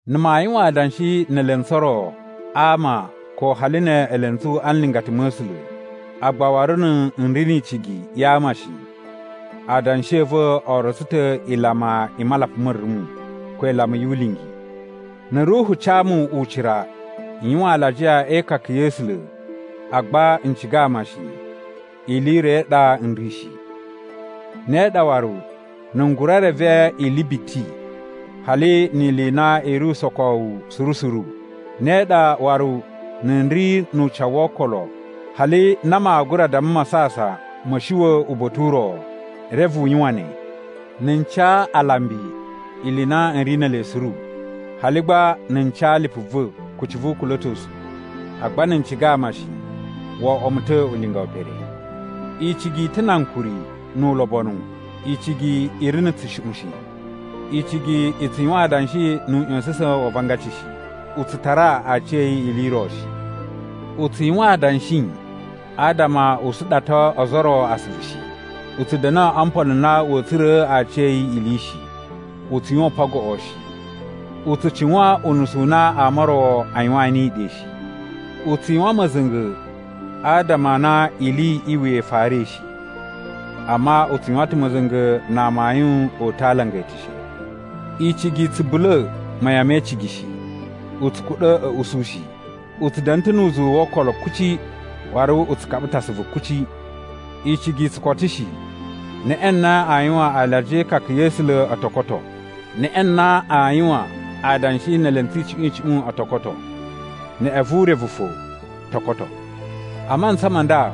Na̱ maa yuwan adanshi ne elentsu o ro a ama ko hali ne elentsu a nlingata ma̱ A̱sula̱, agba waru na̱ n ri ni icigi ya ama shi, adanshi a̱ va̱ o rotso ta̱ ilama i malapa ma̱ rumu, ko ilama yu ulingi. Na̱ Ruhu ca mu ucira n yuwan alajiya e ikaka ya̱ A̱sula̱ agba n ciga ama shi, ili i ro i ɗa n ri shi. Ne ɗa waru na̱ n gura reve ili biti, hali ni ili i na i ri usokowu suru suru. Ne ɗa waru na̱ n ri nu ucawu wo okolo hali na maa gura damma masasan ma̱a̱ shuwa̱ uba̱ta̱ u ro, reve u yuwan ne. Na̱ n ca alambi ili i na n ri ne ele suru, hali gba na̱ n ca lipu va̱ kucci vu ukula̱tosu, agba na̱ n ciga ama shi, wo oꞌwo mu ta̱ ulinga we pere. Icigi i ta̱ na ankuri nu ulobonu. Icigi i ri na̱ tsushuꞌun shi. Icigi i tsu yuwan adanshi nu uꞌya̱sa̱sa̱n wa avangaci shi. U tsu tara aciya̱yi ili i ro shi. U tsu yuwan adanshi adama u suɗato ozo o ro asuvu shi. U tsu da̱na̱ o mpolo n na wa̱a̱ tsura̱a̱ aciya̱yi ili shi. U tsu yuwan upan goꞌo shi. U tsu cuwan unusu u na ama o ro a yuwaan niyi ɗe shi. U tsu yuwan ma̱za̱nga̱ adama a na ili i wuya i farai shi, amma u tsu yuwan ta̱ ma̱za̱nga̱ na amayun o uta̱ a alanga e eteshe. Icigi i tsu bula̱ mayan me icigi shi, u tsu kuɗa̱ a̱ usu shi, u tsu da̱na̱ ta̱ nu uzuwu wo okolo kuci, waru u tsu kaɓa ta̱ asuvu kuci. Icigi i tsu koto shi. Neꞌe na aa yuwan alajiya e ikaka ya̱ A̱sula̱ o to koto. Neꞌe na aa yuwan adanshi ne elentsu icuꞌun icuꞌun o to koto. Neꞌe vu urevu fo to koto. A mantsa ma nda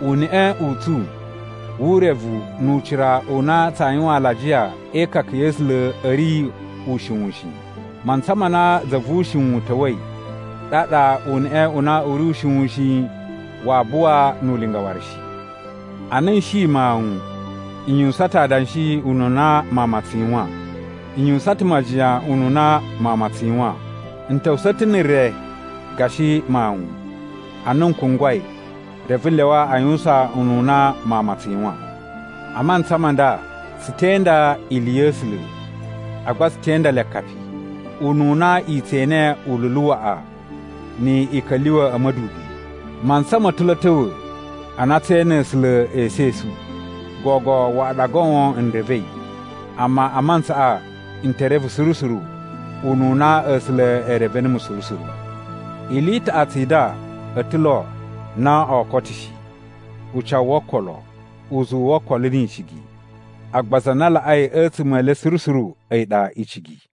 uneꞌe u tsu wu urevu nu ucira u na tsaa yuwan alajiya e ikaka ya̱ A̱sula̱ a̱ ri ushiwun shi, mantsa ma na za vu ushiwun ta̱wa̱i, ɗaɗa uneꞌe u na u ri ushiwun shi waa buwa nu ulinga waru shi. Ana n shi mawun, n yuwusan ta̱ adanshi ununa mawun ma tsu yuwan, n yuwusan ta̱ majiyan ununa mawun ma tsu yuwan, n ta̱wusa̱ ta̱ na̱ re gashi mawun. Ana n kungwai, reve n lyawa a yuwusan ununa mawun ma tsu yuwan. A mantsa ma nda, tsu te inda ili ya̱ A̱sula̱, agba tsu te inda le akapi, ununa i tse ene ululu waꞌa ni i ka̱lyuwa̱ a̱ ma̱dubi. Mantsa ma̱ ta̱ lo a̱a̱ ta̱wa̱ na tsee ene A̱sula̱ esu esu. Gogo waꞌa ɗa goon n revei, amma a mantsaꞌa n te reve suru suru, ununa A̱sula̱ e reve numu suru suru. Ili i taꞌatsu i nda o ta̱ lo no oo koto shi: ucawu wo okolo, uzuwu wo okolo ni icigi, agba za na laꞌai a̱tsuma̱ e le suru suru a̱yi ɗa icigi.